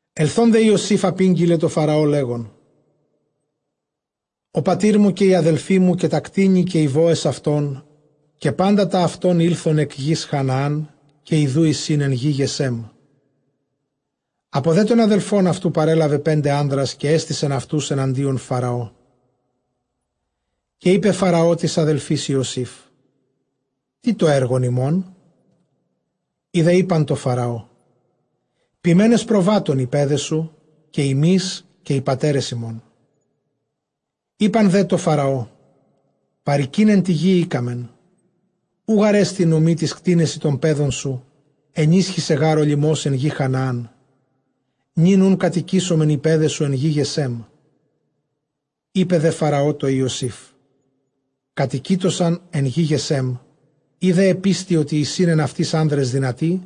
Ἐλθῶν δὲ Ἰωσὴφ ἀπήγγειλε τῷ Φαραῶ, λέγων, ὁ πατὴρ μου, καὶ οἱ ἀδελφοί μου, καὶ τὰ κτήνη, καὶ οἱ βόες αὐτῶν, καὶ πάντα τὰ αὐτῶν, ἦλθον ἐκ γῆς Χαναάν· καὶ ἰδού εἰσιν ἐν γῇ Γεσέμ. Ἀπὸ δὲ τῶν ἀδελφῶν αὐτοῦ παρέλαβε πέντε ἄνδρας, καὶ ἔστησεν αὐτοὺς ἐναντίον Φαραώ. Καὶ εἶπε Φαραὼ τοῖς ἀδελφοῖς Ἰωσὴφ, Τί τὸ ἔργον ὑμῶν; οἱ δὲ εἶπαν τῷ Φαραῷ, ποιμένες προβάτων οἱ παῖδές σου, καὶ ἡμεῖς καὶ οἱ πατέρες ἡμῶν. Εἶπαν δὲ τῷ Φαραῷ, παροικεῖν ἐν τῇ γῇ ἥκαμεν, οὐ γάρ ἐστι νομὴ τοῖς κτήνεσι τῶν παιδων σου, ἐνίσχυσε γὰρ ὁ λιμὸς ἐν γῇ Χανάαν· νῦν οὖν κατοικήσομεν ἐν γῇ Γεσέμ. Εἶπε δὲ Φαραὼ τῷ Ἰωσὴφ, Κατοικείτωσαν ἐν γῇ Γεσέμ· εἰ δὲ ἐπίστῃ, ὅτι εἰσὶν ἐν αὐτοῖς ἄνδρες δυνατοὶ,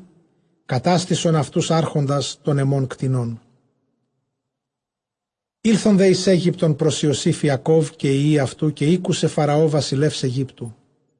κατάστησον αὐτοὺς ἄρχοντας τῶν ἐμῶν κτηνῶν. Ἦλθον δὲ εἰς Αἴγυπτον πρὸς Ἰωσὴφ Ἰακὼβ, καὶ οἱ υἱοὶ αὐτοῦ· καὶ ἤκουσε Φαραὼ βασιλεὺς Αἰγύπτου.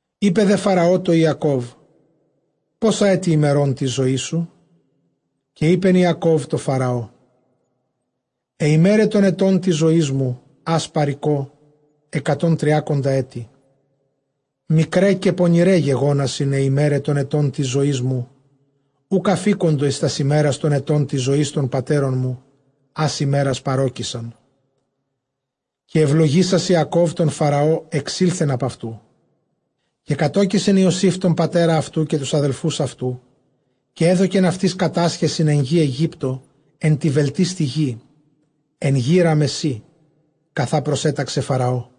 Εἶπε δὲ Φαραὼ τῷ Ἰακὼβ, πόσα ἔτη ἡμερῶν τῆς ζωῆς σου; Καὶ εἶπεν Ἰακὼβ τῷ Φαραῷ, αἱ ἡμέραι τῶν ἐτῶν τῆς ζωῆς μου, ἃς παροικῶ, ἑκατὸν τριάκοντα ἔτη· μικραὶ καὶ πονηραὶ γεγόνασιν αἱ ἡμέραι τῶν ἐτῶν τῆς ζωῆς μου· οὐκ ἀφίκοντο εἰς τὰς ἡμέρας τῶν ἐτῶν τῆς ζῶης τῶν πατέρων μου, ἃς ἡμέρας παρῴκησαν. Καὶ εὐλογήσας Ἰακὼβ τὸν Φαραὼ, ἐξῆλθεν ἀπʼ αὐτοῦ. Καὶ κατῴκισεν Ἰωσὴφ τὸν πατέρα αὐτοῦ, καὶ τοὺς ἀδελφοὺς αὐτοῦ, καὶ ἔδωκεν αὐτοῖς κατάσχεσιν ἐν γῇ Αἰγύπτῳ, ἐν τῇ βελτίστῃ γῇ, ἐν γῇ Ῥαμεσσῆ, καθὰ προσέταξε Φαραώ.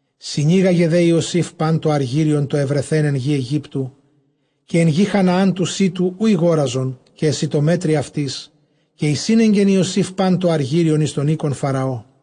Συνήγαγε δὲ Ἰωσὴφ πᾶν τὸ ἀργύριον τὸ εὑρεθὲν ἐν γῇ Αἰγύπτου καὶ ἐν γῇ Χαναὰν, τοῦ σίτου, οὗ ἠγόραζον, καὶ ἐσιτομέτρει αὐτοῖς, καὶ εἰσήνεγκεν Ἰωσὴφ πᾶν τὸ ἀργύριον εἰς τὸν οἶκον Φαραώ.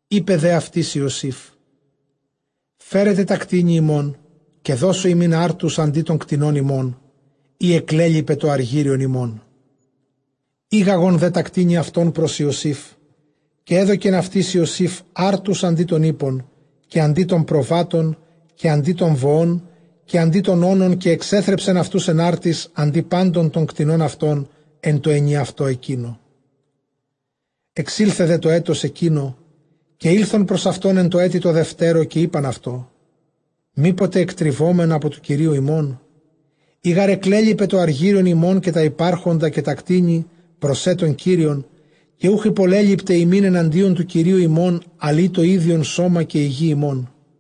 Εἶπε δὲ αὐτοῖς Ἰωσὴφ, φέρετε τὰ κτήνη ὑμῶν, καὶ δώσω ὑμῖν ἄρτους, ἀντὶ τῶν κτηνῶν ὑμῶν, εἰ ἐκλέλοιπε τὸ ἀργύριον ὑμῶν. Ἤγαγον δὲ τὰ κτήνη αὐτῶν πρὸς Ἰωσήφ· καὶ ἔδωκεν αὐτοῖς Ἰωσὴφ ἄρτους ἀντὶ τῶν ἵππων, καὶ ἀντὶ τῶν προβάτων, καὶ ἀντὶ τῶν βοῶν, καὶ ἀντὶ τῶν ὄνων· καὶ ἐξέθρεψεν αὐτοὺς ἐν ἄρτοις ἀντὶ πάντων τῶν κτηνῶν αὐτῶν ἐν τῷ ἐνιαυτῷ ἐκείνῳ. Ἐξῆλθε δὲ τὸ ἔτος ἐκεῖνο, καὶ ἦλθον πρὸς αὐτὸν ἐν τῷ ἔτει τῷ δευτέρῳ, καὶ εἶπαν αὐτῷ, μή ποτε ἐκτριβῶμεν ἀπὸ τοῦ κυρίου ἡμῶν; εἰ γὰρ ἐκλέλοιπε τὸ ἀργύριον ἡμῶν, καὶ τὰ ὑπάρχοντα καὶ τὰ κτήνη πρός σε τὸν κύριον, καὶ οὐχ ὑπολέλειπται ἡμῖν ἐναντίον τοῦ κυρίου ἡμῶν, ἀλλʼ ἢ τὸ ἴδιον σῶμα καὶ ἡ γῆ ἡμῶν,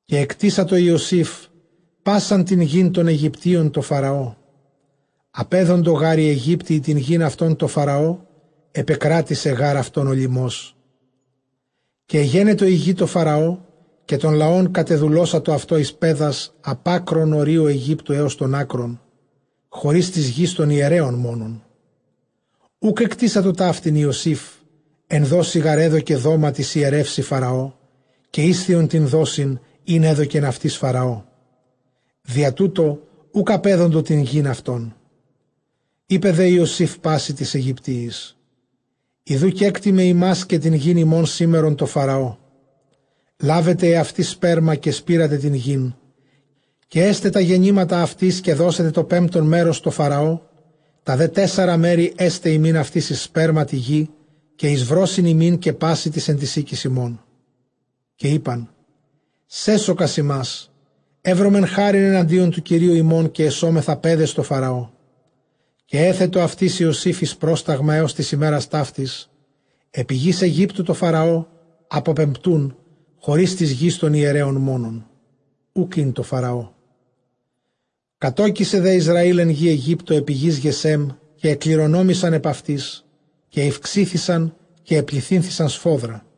Καὶ ἐκτήσατο Ἰωσὴφ πᾶσαν τὴν γῆν τῶν Αἰγυπτίων τῷ Φαραώ· ἀπέδοντο γὰρ οἱ Αἰγύπτιοι τὴν γῆν αὐτῶν τῷ Φαραώ· ἐπεκράτησε γὰρ αὐτῶν ὁ λιμός· καὶ ἐγένετο ἡ γῆ τῷ Φαραώ. Καὶ τὸν λαὸν κατεδουλώσατο αὐτῷ εἰς παῖδας, ἀπʼ ἄκρων ὁρίων Αἰγύπτου ἕως τῶν ἄκρων, χωρὶς τῆς γῆς τῶν ἱερέων μόνον· οὐκ ἐκτήσατο ταύτην Ἰωσήφ· ἐν δόσει γὰρ ἔδωκε δόμα τοῖς ἱερεῦσι Φαραὼ, καὶ ἤσθιον τὴν δόσιν, ἣν ἔδωκεν αὐτοῖς Φαραώ· διὰ τοῦτο οὐκ ἀπέδοντο τὴν γῆν αὐτῶν. Εἶπε δὲ Ἰωσὴφ πᾶσι τοῖς Αἰγυπτίοις, ἰδοὺ κέκτημαι ὑμᾶς καὶ τὴν γῆν ὑμῶν σήμερον τῷ Φαραῷ· λάβετε ἑαυτοῖς σπέρμα, καὶ σπείρατε τὴν γῆν. Καὶ ἔσται τὰ γεννήματα αὐτῆς· καὶ δώσετε τὸ πεμπτὸν μέρος τῷ Φαραώ· τὰ δὲ τέσσαρα μέρη ἔσται ὑμῖν αὐτοῖς εἰς σπέρμα τῇ γῇ, καὶ εἰς βρῶσιν ὑμῖν, καὶ πᾶσι τοῖς ἐν τοῖς οἴκοις ὑμῶν. Καὶ εἶπαν, σέσωκας ἡμᾶς· εὕρομεν χάριν ἐναντίον τοῦ κυρίου ἡμῶν, καὶ ἐσόμεθα παῖδες τῷ Φαραώ. Καὶ ἔθετο αὐτοῖς Ἰωσὴφ εἰς πρόσταγμα ἕως τῆς ἡμέρας ταύτης, ἐπὶ γῆς Αἰγύπτου τῷ Φαραὼ ἀποπεμπτοῦν, χωρὶς τῆς γῆς τῶν ἱερέων μόνον· οὐκ ἧν τῷ Φαραώ. Κατῶκησε δὲ Ἰσραὴλ ἐν γῇ Αἰγύπτῳ ἐπὶ γῆς Γεσὲμ, καὶ ἐκληρονόμησαν ἐπʼ αὐτῆς· καὶ ηὐξήθησαν καὶ ἐπληθύνθησαν σφόδρα.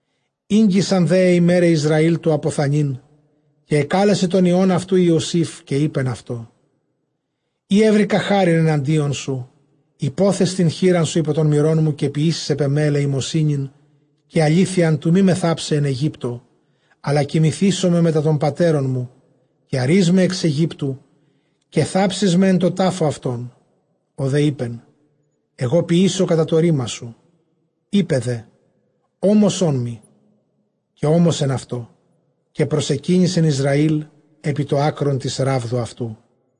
Ἤγγισαν δὲ αἱ ἡμέραι Ἰσραὴλ τοῦ ἀποθανεῖν· καὶ ἐκάλεσε τὸν υἱὸν αὐτοῦ Ἰωσὴφ, καὶ εἶπεν αὐτῷ, εἰ εὕρηκα χάριν ἐναντίον σου, ὑπόθες τὴν χεῖρά σου ὑπὸ τὸν μηρόν μου, καὶ ποιήσεις ἐπʼ ἐμὲ ἐλεημοσύνην, καὶ ἀλήθειαν, τοῦ μή με θάψαι ἐν Αἰγύπτῳ· Ἀλλὰ κοιμηθήσομαι μετὰ τῶν πατέρων μου· καὶ ἀρεῖς με ἐξ Αἰγύπτου, καὶ θάψεις με ἐν τῷ τάφῳ αὐτῶν· ὁ δὲ εἶπεν, ἐγὼ ποιήσω κατὰ τὸ ῥῆμά σου. Εἶπε δὲ, ὄμοσόν μοι· καὶ ὤμοσεν αὐτῷ· καὶ προσεκύνησεν Ἰσραὴλ ἐπὶ τὸ ἄκρον τῆς ῥάβδου αὐτοῦ.